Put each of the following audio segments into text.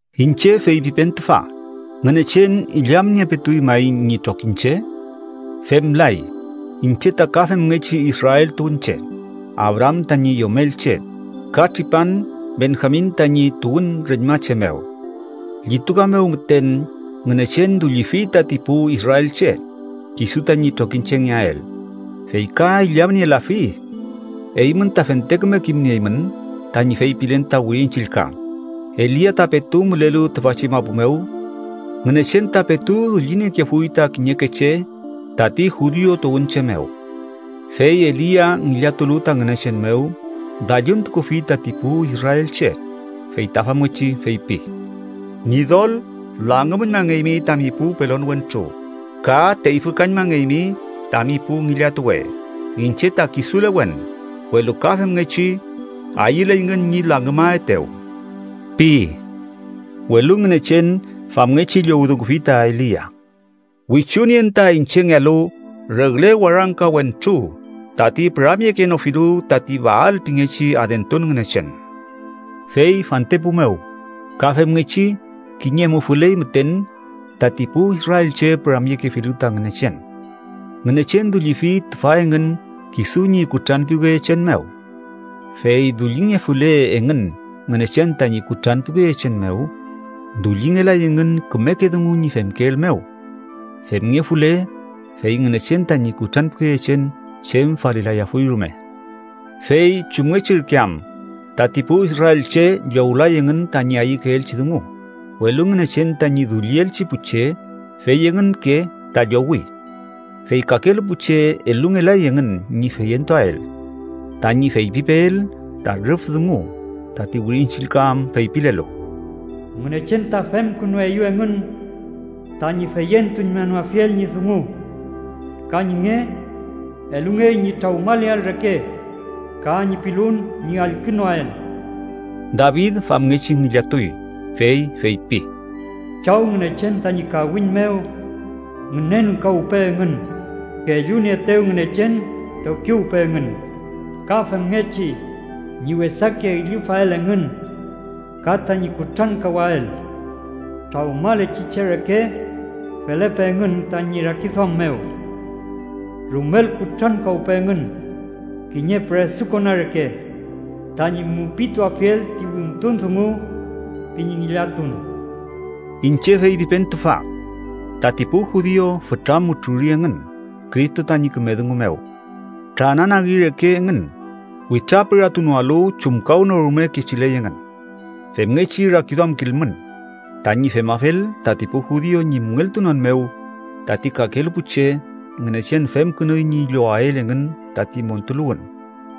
Iñche feypipen tüfa, ¿Ngünechen illamniepetuy may ñi trokiñche? ¡Femlay! Iñche ta ka femngechi Israel tuwünche, Abraam tañi yomelche, ka tripan Benjamin tañi tuwün reñmache mew. Llituka mew müten Ngünechen dullifi tati pu israelche, kisu tañi trokiñchengeael, fey ka illamnielafi. Eymün ta fente küme kimnieymün tañi feypilen ta Wirin Chillka Elia ta petu mülelu tüfachi mapu mew Ngünechen ta petu dulliniekefuy ta kiñeke che tati judiu tuwünche mew. Fey Elia, ngillatulu ta Ngünechen mew, dalluntukufi tati pu israelche. Fey ta famngechi feypi: “Ñidol, langümüñmangeymi tami pu pelon wentru ka teyfükañmangeymi tami pu ngillatuwe. Iñche ta kisulewen, welu ka femngechi ayüleyngün ñi langümaetew” pi. Welu Ngünechen famngechi llowdungufi ta Elia: “Wichunien ta iñchengealu regle warangka wentru tati püramyekenofilu tati Baal pingechi adentun ngünechen.” Fey fantepu mew ka femngechi kiñe mufüley müten tati pu israelche püramyekefilu ta Ngünechen. Ngünechen dullifi tüfa engün kisu ñi kutranpiwkeyechen mew. Fey dullingefule engün Ngünechen tañi kutranpiwkeyechen mew, dullingelay engün kümeke dungu ñi femkeel mew. Femngefule, fey Ngünechen tañi kutranpiwkeyechen chem falilayafuy rume. ¿Fey chumngechi ürke am? Tati pu israelche llowlay engün tañi ayükeelchi dungu, welu Ngünechen tañi dullielchi pu che, fey engünke ta llowi. Fey kakelu pu che elungelay engün ñi feyentuael. Tañi feypipeel ta rüf dungu tati Wirin Chillka am feypilelu: “Ngünechen ta femkünueyew engün tañi feyentuñmanoafiel ñi dungu. Ka ñi nge elungey ñi trawmaleael reke ka ñi pilun ñi allkünoael.” David famngechi ngillatuy, fey feypi: “Chaw Ngünechen tañi kawiñ mew ngünenkawpe engün kellunieetew Ngünechen trokiwpe engün. Ka femngechi ñi wesake üllüfael engün ka tañi kutrankawael. Trawmalechi che reke felepe engün tañi rakiduam mew. Rumel kutrankawpe engün kiñe püresukona reke tañi mupituafiel ti wimtun dungu ―pi ñi ngillatun.” Iñche feypipen tüfa: Tati pu judiu fütra mutruri engün Cristo tañi küme dungu mew. Trananagi reke engün, witrapüratunoalu chumkawnorume kechiley engün. Femngechi rakiduamkilmün. Tañi femafel, tati pu judiu ñi müngeltunon mew, tati kakelu pu che Ngünechen femkünuy ñi llowael engün tati montuluwün,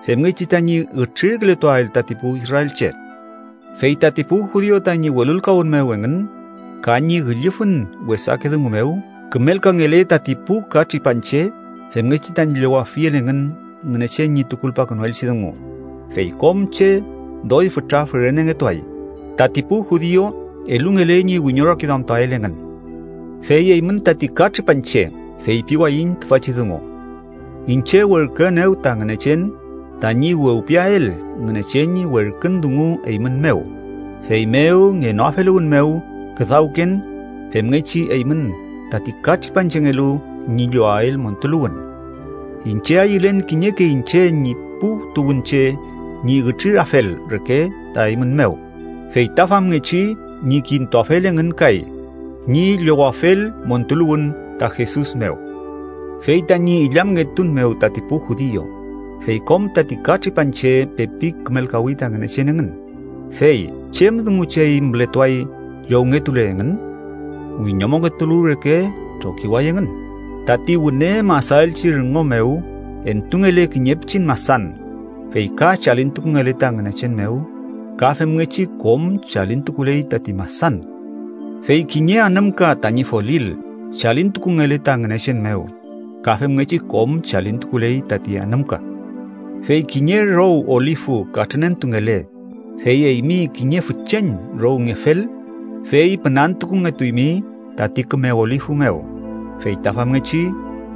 femngechi tañi ütrirkületuael tati pu israelche. Fey tati pu judiu tañi welulkawün mew engün ka ñi üllüfün wesake dungu mew kümelkangele tati pu katripanche femngechi tañi llowafiel engün Ngünechen ñi tukulpakünuelchi dungu, fey kom che doy fütra fürenengetuay, tati pu judiu elungele ñi wiñorakiduamtuael engün. Fey eymün tati katripanche feypiwayiñ tüfachi dungu. Iñche werküenew ta Ngünechen tañi wewpiael Ngünechen ñi werkün dungu eymün mew, feymew ngenoafeluwün mew küdawken femngechi eymün tati katripanchengelu ñi llowael montuluwün. Iñche ayülen kiñeke iñche ñi pu tuwünche ñi ütrirafel reke ta eymün mew, feyta famngechi ñi kintuafel engün kay ñi llowafel montuluwün ta Jesus mew. Fey tañi illamngetun mew tati pu judiu, fey kom tati katripanche pepi kümelkawi ta Ngünechen engün, fey ¿chem dungu chey mületuay llowngetule engün? ¡Wiñomongetulu reke trokiway engün! Tati wüne masaelchi rüngo mew entungele kiñe pichin masan fey ka chalintukungele ta Ngünechen mew, ka femngechi kom chalintukuley tati masan. Fey kiñe anümka tañi folil chalintukungele ta Ngünechen mew, ka femngechi kom chalintukuley tati anümka. Fey kiñe row olifu katrünentungele, fey eymi kiñe fücheñ rowngefel, fey pünantukungetuymi tati küme olifu mew, fey ta famngechi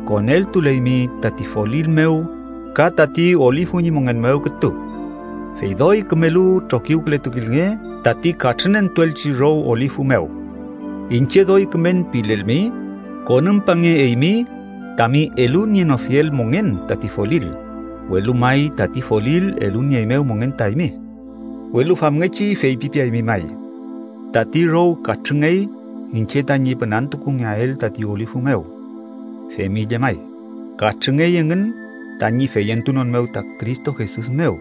koneltuleymi tati folil mew ka tati olifu ñi mongen mew kütu. Fey doy kümelu trokiwkületukilnge tati katrünentuelchi row olifu mew. Iñche doy kümen pilelmi, konümpange eymi tami elunienofiel mongen tati folil, welu may tati folil elunieeymew mongen ta eymi. Welu famngechi feypipeaymi may: “Tati row katrüngey iñche tañi pünantukungeael tati olifu mew.” Femi llemay, katrüngey engün tañi feyentunon mew ta Cristo Jesus mew,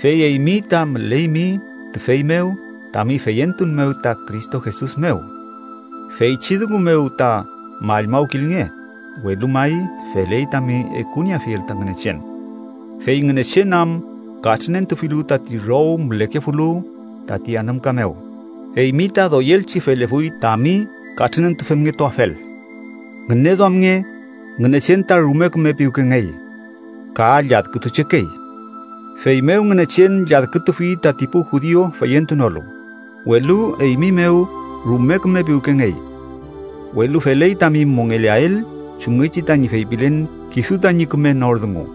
fey eymi ta müleymi tüfey mew tami feyentun mew ta Cristo Jesus mew. Feychi dungu mew ta mallmawkilnge, welu may feley tami ekunieafiel ta Ngünechen. Fey Ngünechen am katrünentufilu tati row mülekefulu tati anümka mew, eymi ta doyelchi felefuy tami katrünentufemngetuafel. Ngüneduamnge, Ngünechen ta rume küme piwkengey, ka lladkütuchekey. Feymew Ngünechen lladkütufi tati pu judiu feyentunolu, welu eymi mew rume küme piwkengey. Welu feley tami mongeleael chumngechi tañi feypilen kisu tañi küme nor dungu.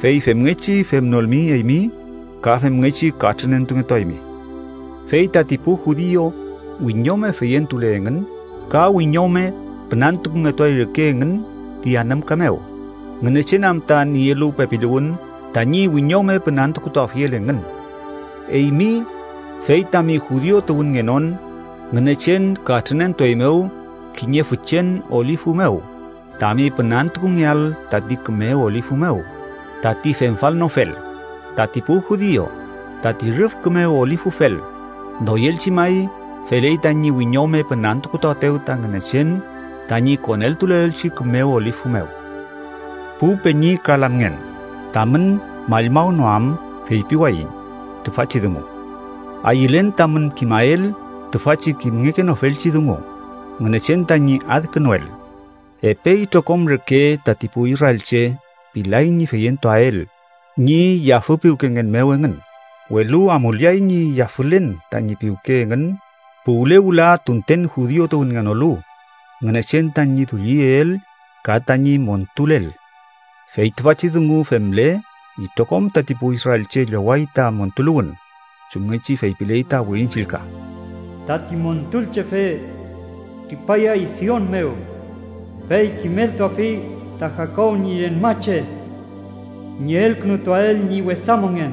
Fey femngechi femnolmi eymi, ka femngechi katrünentungetuaymi. Fey tati pu judiu wiñome feyentule engün, ka wiñome pünantukungetuay reke engün ti anümka mew, Ngünechen am ta nielu pepiluwün tañi wiñome pünantukutuafiel engün. Eymi, fey tami judiu tuwünngenon, Ngünechen katrünentueymew kiñe fücheñ olifu mew, tami pünantukungeael tati küme olifu mew, tati femfalnofel, tati pu judiu, tati rüf küme olifufel, ¡doyelchi may feley tañi wiñome pünantukutuaetew ta Ngünechen tañi koneltuleelchi küme olifu mew! Pu peñi ka lamngen, tamün mallmawnoam feypiwayiñ tüfachi dungu: ayülen tamün kimael tüfachi kimngekenofelchi dungu Ngünechen tañi adkünuel: epe itrokom reke tati pu israelche pilay ñi feyentuael ñi yafüpiwkengen mew engün, welu amuleay ñi yafülen tañi piwke engün puwle wüla tunten judiu tuwünngenolu Ngünechen tañi dulliyeel ka tañi montulel. Fey tüfachi dungu femle, itrokom tati pu israelche lloway ta montuluwün, chumngechi feypiley ta Wirin Chillka: “Tati Montulchefe tripayay Sion mew. Fey kimeltuafi ta Jakob ñi reñmache ñi elkünutuael ñi wesa mongen.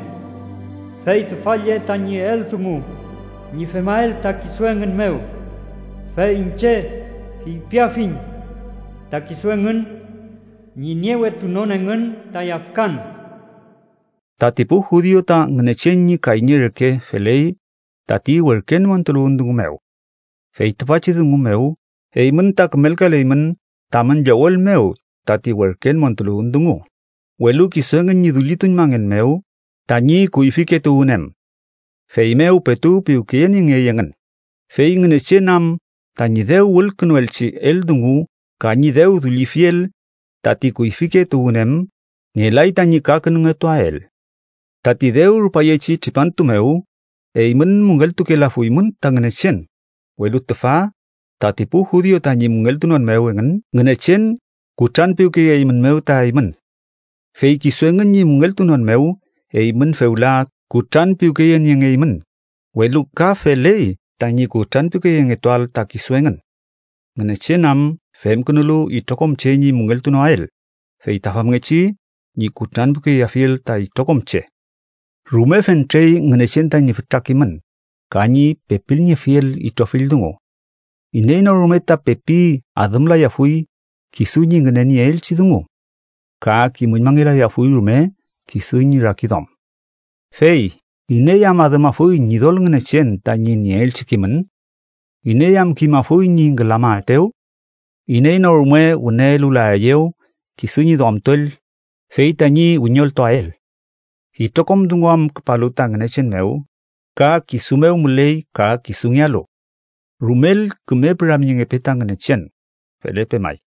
Fey tüfa lle tañi eldungu ñi femael ta kisu engün mew, fey iñche feypiafiñ ta kisu engün ñi niewetunon engün ta yafkan.” Tati pu judiu ta Ngünechen ñi kayñe reke feley tati werken montuluwün dungu mew. Fey tüfachi dungu mew eymün ta kümelkaleymün tamün llowel mew tati werken montuluwün dungu, welu kisu engün ñi dullituñmangen mew tañi kuyfike tuwün em, feymew petu piwkeyeniengey engün, fey Ngünechen am tañi dew wülkünuelchi eldungu ka ñi dew dullifiel tati kuyfike tuwün em ngelay tañi kakünungetuael. Tati dew rupayechi tripantu mew, eymün müngeltukelafuymün ta Ngünechen, welu tüfa tati pu judiu tañi müngeltunon mew engün, Ngünechen kutranpiwkeyeeymünmew ta eymün. Fey kisu engün ñi müngeltunon mew, eymün fewla kutranpiwkeyeniengeymün, welu ka feley tañi kutranpiwkeyengetuael ta kisu engün. Ngünechen am femkünulu itrokom che ñi müngeltunoael, feyta famngechi ñi kutranpiwkeyeafiel ta itrokom che. ¡Rume fentrey Ngünechen tañi fütra kimün, ka ñi pepilniefiel itrofill dungu! ¡Iney no rume ta pepi adümlayafuy kisu ñi ngünenieelchi dungu! ¡Ka kimüñmangelayafuy rume kisu ñi rakiduam! Fey “¿iney am adümafuy Ñidol Ngünechen tani nieelchi kimün? ¿Iney am kimafuy ñi ngülamaetew? Iney no rume wüne elulaeyew kisu ñi duamtuel, fey tañi wiñoltuael.” ¡Itrokom dungu am küpalu ta Ngünechen mew, ka kisu mew müley ka kisungealu! ¡Rumel küme püramyengepe ta Ngünechen! Felepe may.